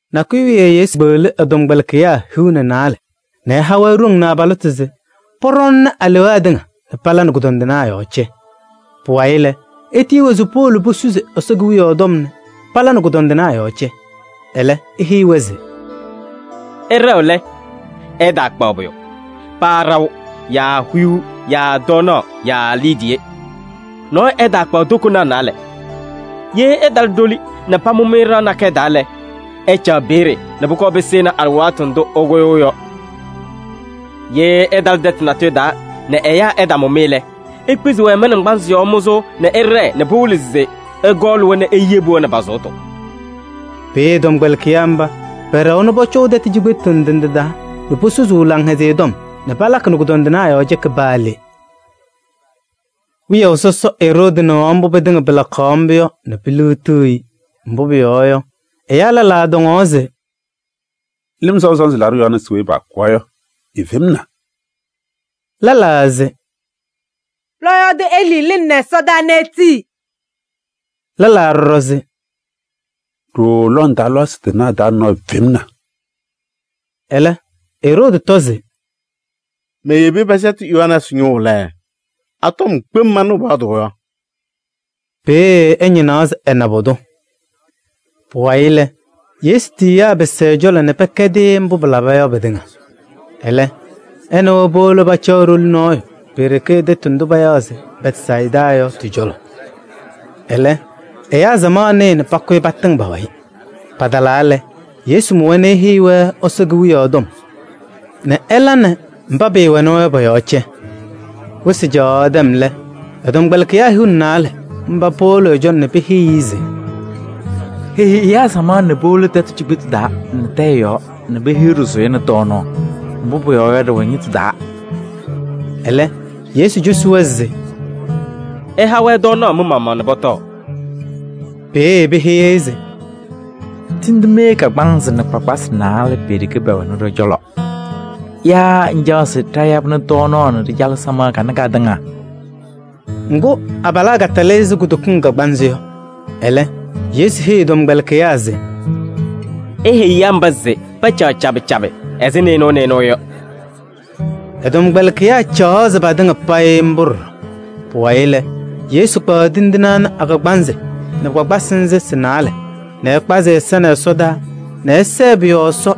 Nakʋyʋ wiye Yesu kpeɣli ɛ-tɔmkpɛlɩkɩyaa hiu nɛ naalɛ nɛ ɛha-wɛ ɖoŋ nɛ abalɩtʋ se pɔɖɔɔnɩnɩ alewaa tɩŋa nɛ pala nɛ kʋdɔndɩnaa yɔɔ cɛ. Pʋwayɩ lɛ, etiyi-wɛ se powolo posusi Ɛsɔ Kewiyaɣ tɔm nɛ pala nɛ kʋdɔndɩnaa yɔɔ cɛ. Ɛlɛ eheyi-wɛ se: “Ɩɖɛɣ lɛ, ɩtaakpaɣ pʋyʋ: paa ɖaʋ yaa huyuu yaa tɔɔnaɣ yaa liidiye. Nɔɔyʋ ɛtaakpaɣ tokonaa naalɛ. Ye ɩtalɩ ɖoli nɛ pamʋ-mɩ ɖɩɣa nakɛyɛ taa lɛ, ɩcaɣ peeye nɛ pʋkɔɔ pɩsɩnɩ alɩwaatʋ ndʋ ɩkʋyʋʋ yɔ. Ye ɩtalɩ tɛtʋ natʋyʋ taa nɛ ɛyaa ɛtamʋ-mɩ lɛ, ikpizi-wɛ mɩ-naŋgbanzɩ yɔɔ mʋzʋʋ nɛ ɩɖɛɛ nɛ pɩwɩlɩ se ɩkɔɔlɩ-wɛ nɛ iyebi-wɛ nɛ pa-sʋʋtʋ. Peeye tɔmkpɛlɩkɩyaa mba pɛɖɛwa nɛ pɔcɔʋ tɛtʋ cikpetu ndɩ ndɩ taa nɛ posusuu Laŋhɛzɩyɛ Tɔm nɛ palakɩ nɛ kʋdɔndɩnaa yɔɔ cɛkɩ paa le.” Wiyaʋ sɔsɔ Eroodi nɩɣaɣ mbʋ pɩtɩŋa pɩlakaɣ mbʋ yɔ nɛ piliɣtiɣ-i. Mbʋ pʋyɔɔ yɔ, ɛyaa lɛlaa tɔŋaɣ se: “Lɩm Sɔʋ Sɔnzɩ Laɖʋ Yohanɛɛsɩ weyi paakʋwa yɔ efemna.” Lɛlaa se: “Lɔɔyaɣ tʋ Elii lɩnɩnɩ ɛsɔdaa nɛ etii.” Lɛlaa ɖɔɖɔ se: “Ɖooo lɔŋ taa lɔɔyɩsɩ tɩnaa taa nɔɔyʋ femna.” Ɛlɛ Eroodi tɔ se: “Meyebi pɛsɛtɩ Yohanɛɛsɩ ñʋʋ lɛ, a-tɔm kpem manɩɣ pɔyɔɔdʋʋ yɔ?” Peeye ɛñɩnaɣ se ɛna pʋdʋ. Pʋwayɩ lɛ, Yesu tiyiyaa pɩsɩ ɛ-cɔlɔ nɛ pɛkɛdɩ-ɩ mbʋ palaba yɔ pɩtɩŋa. Ɛlɛ ɛ nɛ wɛ powolo pacaɣ ɖoli nɔɔyʋ pe-ɖeke tɛtʋ ndʋ payaɣ se Bɛtsayɩda yɔ tɩ-cɔlɔ. Ɛlɛ, ɛyaa samaɣ nɩɩ nɛ pakʋyɩ patɩŋ pa-wayɩ. Patalaa lɛ, Yesu mʋ-wɛ nɛ eheyi-wɛ Ɛsɔ Kewiyaɣ tɔm nɛ ɛla nɛ mba pɩɩwɛnɩ-wɛ yɔ pɔ-yɔɔ cɛ. Wɩsɩ caɣaɣ tɛm lɛ, ɛ-tɔmkpɛlɩkɩyaa hiu nɛ naalɛ mba powolo ɛ-cɔlɔ nɛ peheyi-i se: “Heyi ɛyaa samaɣ nɛ powolo tɛtʋ cikpetu taa nɛ tɛyɛ yɔɔ nɛ pehiɣ ɖɩsʋyɛ nɛ tɔɔnaɣ. Mbʋ pʋyɔɔ yɔ, ɖɩwɛ ñɩtʋ taa.” Ɛlɛ Yesu cosi-wɛ se: “Ɩha-wɛ tɔɔnaɣ mɩ-maɣmaɣ nɛ pɔtɔɔ.” Peeye peheyi-i se: “Tindine kagbaanzɩ nɛ kpakpasɩ naalɛ pe-ɖeke pɛwɛnɩ ɖɔ-cɔlɔ. Yaa ŋcaɣ se ɖayabɩnɩ tɔɔnaɣ nɛ ɖɩcalɩ ɛyaa samaɣ kanɛ katɩŋa?” Ŋgʋ, abalaa katalɩ ɛzɩ kudokiŋ kagbaanzɩ yɔ. Ɛlɛ Yesu heyi ɛ-tɔmkpɛlɩkɩyaa se: “Iheyi ɛyaa mba se pacaɣ cabɩ cabɩ ɛzɩ nɩɩnʋwa nɩɩnʋwa yɔ.” Ɛ-tɔmkpɛlɩkɩyaa caɣzɩ patɩŋa payɩ mbʋ ɖɔɖɔ. Pʋwayɩ lɛ, Yesu kpaɣ tindine ana a-kagbaanzɩ nɛ kpakpasɩ nzɩ sɩ-naalɛ nɛ ɛkpazɩ ɛ-ɛza ɛsɔdaa nɛ ɛsɛɛ pʋ-yɔɔ Ɛsɔ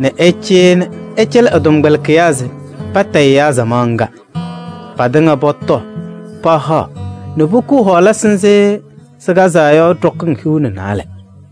nɛ ɛcɩyɩ nɛ ɛcɛlɩ ɛ-tɔmkpɛlɩkɩyaa se patayɩ ɛyaa samaɣ ŋga. Patɩŋa pɔtɔɔ pahaɣ nɛ pokuu hɔɔlasɩ nzɩ sɩkazaa yɔ ɖɔkɩŋ hiu nɛ naalɛ.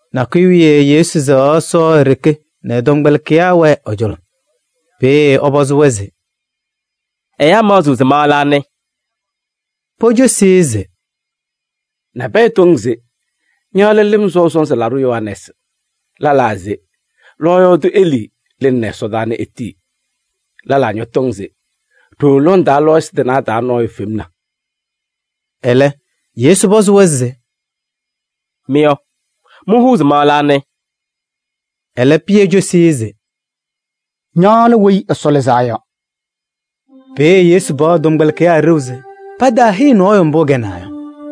Nakʋyʋ wiye Yesu sɛɣaɣ Ɛsɔ e-ɖeke nɛ ɛ-tɔmkpɛlɩkɩyaa wɛɛ ɛ-cɔlɔ. Peeye ɛpɔzɩ-wɛ se: “Ɛyaa maɣzɩɣ se ma lɛ anɩ?” Pocosi-i se: “Nabɛyɛ tɔŋ se ña lɛ Lɩm Sɔʋ Sɔnzɩ Laɖʋ Yohanɛɛsɩ. Lɛlaa se lɔɔyaɣ tʋ Elii lɩnɩnɩ ɛsɔdaa nɛ etii. Lɛlaa ñɔtɔŋ se ɖooo lɔŋ taa lɔɔyɩsɩ tɩnaa taa nɔɔyʋ femna.” Ɛlɛ Yesu pɔzɩ-wɛ se: “Mɩ yɔ, mɩhʋʋ se ma lɛ anɩ?” Ɛlɛ Pɩyɛ cosi-i se: “Ña lɛ Weyi Ɛsɔ Lɩzaa Yɔ.” Peeye Yesu paɣ ɛ-tɔmkpɛlɩkɩyaa ɖeu se pataaheyi nɔɔyʋ mbʋ ɛkɛnaa yɔ.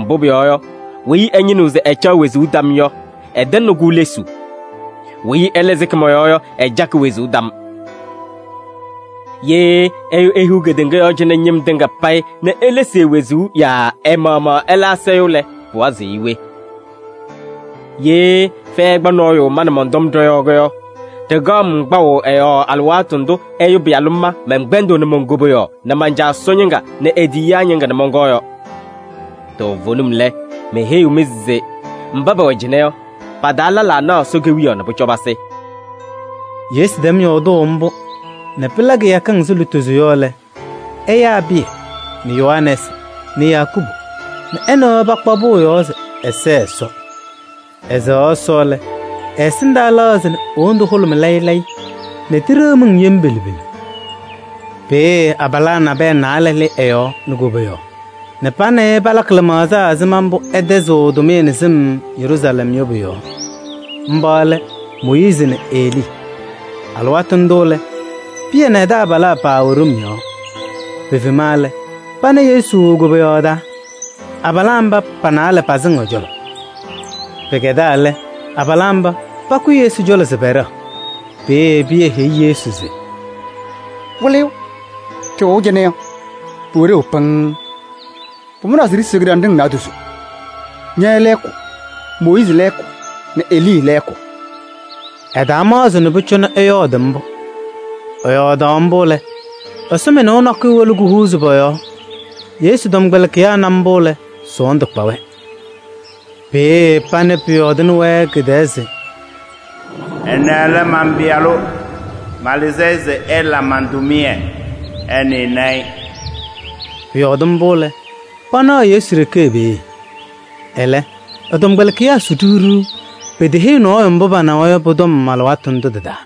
Mbʋ pʋyɔɔ yɔ, weyi ɛñɩnɩɣ se ɛcaɣ wezuu tam yɔ, ɛtɛŋnɩ-kʋ lesuu. Weyi ɛlɛ sɩkɩ mɔ-yɔɔ yɔ, ɛcakɩ wezuu tam. Ye ɛyʋ ehiɣ kedeŋa yɔɔ cɩnɛ ñɩm tɩŋa payɩ nɛ elesi e-wezuu yaa ɛ-maɣmaɣ ɛla asayʋʋ lɛ, pɩwazɩɣ-ɩ we? Ye fɛyɛ ɛkpa nɔɔyʋ ma nɛ mɔn-tɔm ɖɔ-yɔɔ yɔ, ɖɩkaɣ-m kpaʋ ɛ-yɔɔ alɩwaatʋ ndʋ Ɛyʋ Pɩyalʋ ma mɛnkpɛndɩɣnɩ mon-koboyaɣ nɛ man-Caa Ɛsɔ ñɩŋga nɛ e-tiyiyaa ñɩŋga nɛ mɔnkɔɔ yɔ. Toovenim lɛ, meheyiɣ-mɩ se mba pɛwɛ cɩnɛ yɔ, pa-taa lɛlaa naɣ Ɛsɔ Kewiyaɣ nɛ pʋcɔ pasɩ.” Yesu tɛm yɔɔdʋʋ mbʋ nɛ pɩla kɩyakɩŋ ɛzɩ lutozo yɔ lɛ, ɛyaa Pɩyɛ nɛ Yohanɛɛsɩ nɛ Yakubu nɛ ɛ nɛ wɛ pakpa pʋʋ yɔɔ se ɛsɛɛ Ɛsɔ. Ɛsɛɣaɣ Ɛsɔ lɛ, ɛ-ɛsɩndaa lɛɣzɩ nɛ e-wondu hʋlʋmɩ layɩ layɩ nɛ tiɖeɣ miŋ yem pelu pelu. Peeye abalaa naalɛ nabɛyɛ lɩ ɛ-yɔɔ nɛ koboyaɣ nɛ pa nɛ ɩ palakɩ lɩmaɣza ɛzɩma mbʋ ɛtɛzɩɣ ɛ-tʋmɩyɛ nɛ sɩm Yeruusalɛm yɔ pʋ-yɔɔ. Mba lɛ Mooyiizi nɛ Elii. Alɩwaatʋ ndʋ lɛ, Pɩyɛ nɛ ɛ-taabalaa paawɛ ɖom yɔɔ. Pefema lɛ, pana Yesu e-koboyaɣ taa, abalaa mba pa-naalɛ pasɩŋ ɛ-cɔlɔ. Pɩkɛdaa lɛ, abalaa mba pakʋyɩ Yesu cɔlɔ se pɛɖɛɣ. Peeye Pɩyɛ heyi Yesu se: “Wɩlɩyʋ! Ɖɩwɛʋ cɩnɛ yɔ, pʋwɛ ɖeu pɩŋŋ. Pʋmʋnaa se ɖisiɣ kɩɖanɖɩŋ naadozo: ña lɛɛkʋ, Mooyiizi lɛɛkʋ nɛ Elii lɛɛkʋ.” Ɛtaamaɣzɩ nɛ pʋcɔ ɛyɔɔdɩ mbʋ. Ɛyɔɔdaɣ mbʋ lɛ, ɛsɔmɩnʋʋ nakʋyʋ wolo kuhuuzi pɔ-yɔɔ. Yesu tɔmkpɛlɩkɩyaa na mbʋ lɛ, sɔɔndʋ kpa-wɛ. Peeye panɩ pʋyɔɔdʋʋnɩ-wɛ nɛ kɩ-tɛɛ se: “Ɛnɛ lɛ man-Pɩyalʋ. Malɩzɩ-ɩ se ɛla man-tʋmɩyɛ, ɩnɩnɩ-ɩ.” Pʋyɔɔdɩ mbʋ lɛ, panaɣ Yesu ɖeke peeye. Ɛlɛ, ɛ-tɔmkpɛlɩkɩyaa su ɖiɣ ɖiɣ, peteheyi nɔɔyʋ mbʋ panawa yɔ pʋ-tɔm alɩwaatʋ ndʋ tɩ-taa.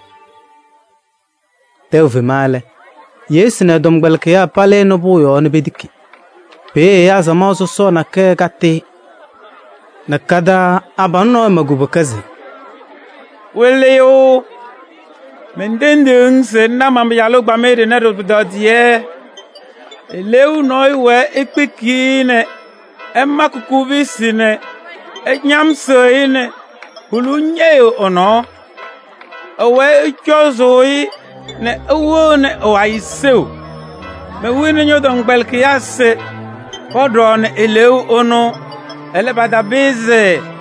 Tɛʋ fema lɛ, Yesu nɛ ɛ-tɔmkpɛlɩkɩyaa palɩnɩ pʋʋ yɔɔ nɛ petiki. Peeye ɛyaa samaɣ sɔsɔɔ nakɛyɛ katɩ-ɩ nɛ ka-taa abalʋ nɔɔyʋ ma kubuka se: “Wɩlɩyʋ! Mentendiɣ-ŋ se ŋna man-pɩyalʋ ɛgbamɩyɛ ɖɩnɛ ɖɩ-pʋtɔdɩyɛ. Eleeu nɔɔyʋ wɛɛ ekpiki-i nɛ ɛmakɩ kobusi nɛ ɛñamsɩɣ-ɩ nɛ huluu ñɛyɩɣ ɛ-nɔɔ. Ɛwɛɛ ɛcɔzʋʋ-ɩ nɛ ɛwɩɣnɩ ɛ-wayɩ seu. Mewini ñɔ-tɔmkpɛlɩkɩyaa se pɔɖɔɔnɩ eleeu ɛnʋ, ɛlɛ, patapɩzɩ.”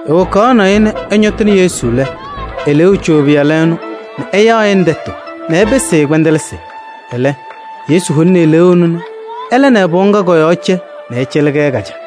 Ewokaɣnɩ-ɩ nɛ ɛñɔtɩnɩ Yesu lɛ, eleeu co ɛ-pɩyalʋ ɛnʋ nɛ ɛyaɣnɩ tɛtʋ nɛ ɛpɩsɩ-ɩ kpɛndɛlɩsɩ. Ɛlɛ, Yesu holini eleeu ɛnʋ nɛ ɛla nɛ pɩɣa ŋga kɔ-yɔɔ cɛ nɛ ɛcɛlɩ-kɛ ka-caa.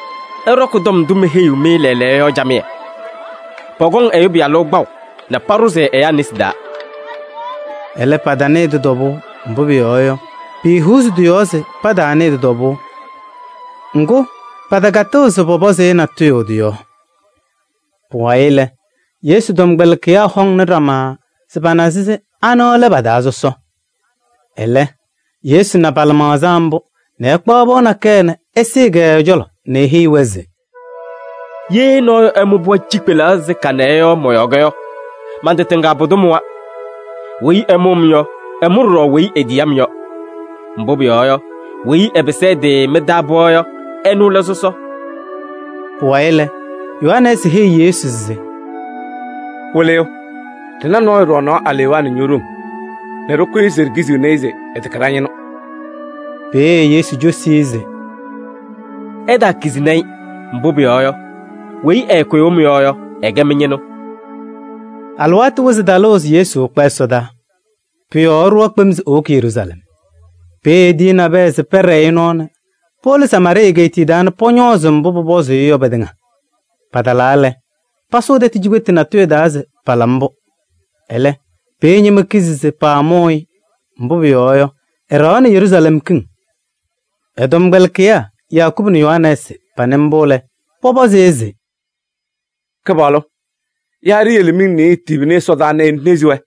“Ɩɖɔkɩ tɔm ndʋ meheyiɣ-mɩ lɛɛlɛɛyɔ yɔ camɩyɛ. Pɔkɔŋ Ɛyʋ Pɩyalʋ kpaʋ nɛ paɖʋzɩ ɛyaa nesi taa.” Ɛlɛ, patanɩɩ tɩ-tɔbʋʋ, mbʋ pʋyɔɔ yɔ, piihuuzi tɩ-yɔɔ se pataanɩɩ tɩ-tɔbʋʋ. Ŋgʋ, patakatɩɣ se pɔpɔzɩ-ɩ natʋyʋ tɩ-yɔɔ. Pʋwayɩ lɛ, Yesu tɔmkpɛlɩkɩyaa hɔŋnɩ ɖama tɔm se pana se anɩ lɛ pa-taa sɔsɔ. Ɛlɛ Yesu na pa-lɩmaɣza mbʋ nɛ ɛkpaɣ pɩɣa nakɛyɛ nɛ ɛsɩɩ-kɛ ɛ-cɔlɔ nɛ eheyi-wɛ se: “Ye nɔɔyʋ ɛmʋ pɩɣa cikpelaɣ ɛzɩ kanɛ yɔ mɔ-yɔɔ yɔ, man-tɩ tɩŋa pʋdʋ mʋwa. Weyi ɛmʋ-m yɔ, ɛmʋ ɖɔɖɔ weyi etiyi-m yɔ. Mbʋ pʋyɔɔ yɔ, weyi ɛpɩsɩ ɛ-tɩ mɩ-taa pɩɣa yɔ, ɛnʋ lɛ sɔsɔ.” Pʋwayɩ lɛ, Yohanɛɛsɩ heyi Yesu se: “Wɩlɩyʋ, ɖɩna nɔɔyʋ ɖɔɔnaɣ alewaa nɛ ño-ɖoŋ nɛ ɖɩkʋyɩ se ɖikiziɣni-i se ɛtɛkɛ ɖa-ñɩnʋ.” Peeye Yesu cosi-i se: “Ɩtaakizini-i, mbʋ pʋyɔɔ yɔ, weyi ɛɛkʋyʋʋ mɩ-yɔɔ yɔ, ɛkɛ mɩ-ñɩnʋ.” Alɩwaatʋ wɩzɩ talʋʋ se Yesu ɛkpa ɛsɔdaa. Pʋ-yɔɔ ɛɖʋwa kpem se ewoki Yeruusalɛm. Peeye etiyi nabɛyɛ se pɛɖɛɛ-ɩ nɔɔ nɛ powolo Samaarɩɩ egeetiye taa nɛ pɔñɔɔzɩ-ɩ mbʋ pʋpɔzʋʋ-ɩ yɔ pɩtɩŋa. Patalaa lɛ, pasʋʋ tɛtʋ cikpetu natʋyʋ taa se pala mbʋ. Ɛlɛ, peeye ñɩma kizi se paamʋʋ-ɩ, mbʋ pʋyɔɔ yɔ, ɛɖɛɣaɣnɩ Yeruusalɛm kiŋ. Ɛ-tɔmkpɛlɩkɩyaa Yakubu nɛ Yohanɛɛsɩ panɩ mbʋ lɛ, pɔpɔzɩ-ɩ se: “Kɩpaɣlʋ! Yaa ɖiyele nɛ miŋ nɩɩyɩ tibini ɛsɔdaa nɛ enezi-wɛ?”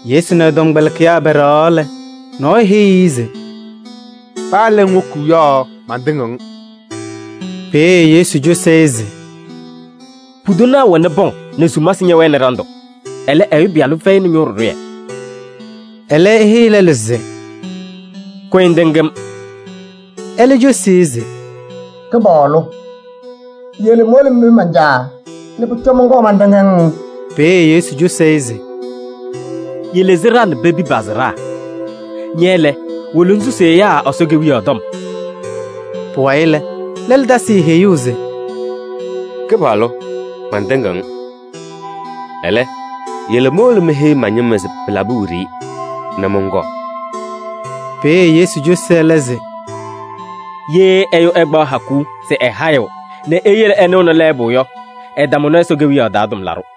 Yesu nɛ ɛ-tɔmkpɛlɩkɩyaa pɛɖɛɣaɣ lɛ, nɔɔyʋ heyi-i se: “Paa le ŋwoki yɔ, mantɩŋɩɣ-ŋ.” Peeye Yesu cosi-i se: “Pudanaa wɛnɩ pɔŋ nɛ sumasɩ ñɛwɛnɩ ɖandʋ, ɛlɛ, Ɛyʋ Pɩyalʋ fɛyɩnɩ ñʋʋ ɖɩɖʋyɛ.” Ɛlɛ eheyi lɛlʋ se: “Kʋyɩ ŋtɩŋ-m.” Ɛlɛ cosi-i se: “Kɩpaɣlʋ! Yele mowolo menpi man-caa nɛ pʋcɔ mɔnkɔɔ mantɩŋ-ŋ.” Peeye Yesu cosi-i se: “Yele sɩɖaa nɛ pepi pa-sɩɖaa. Ña lɛ, wolo ŋsusi ɛyaa Ɛsɔ Kewiyaɣ tɔm.” Pʋwayɩ lɛ, lɛlʋ tasɩ-ɩ heyuu se: “Kɩpaɣlʋ! Mantɩŋɩɣ-ŋ. Ɛlɛ, yele mowolo meheyi ma-ñɩma se pɩlabɩ wiɖiyi nɛ mɔnkɔɔ.” Peeye Yesu cosi ɛlɛ se: “Ye ɛyʋ ɛkpaɣ hakuu se ɛhayɩɣ nɛ eyele ɛnɩɣnɩ lɛɛbʋ yɔ, ɛtamʋnɩ Ɛsɔ Kewiyaɣ taa tʋmlaɖʋ.”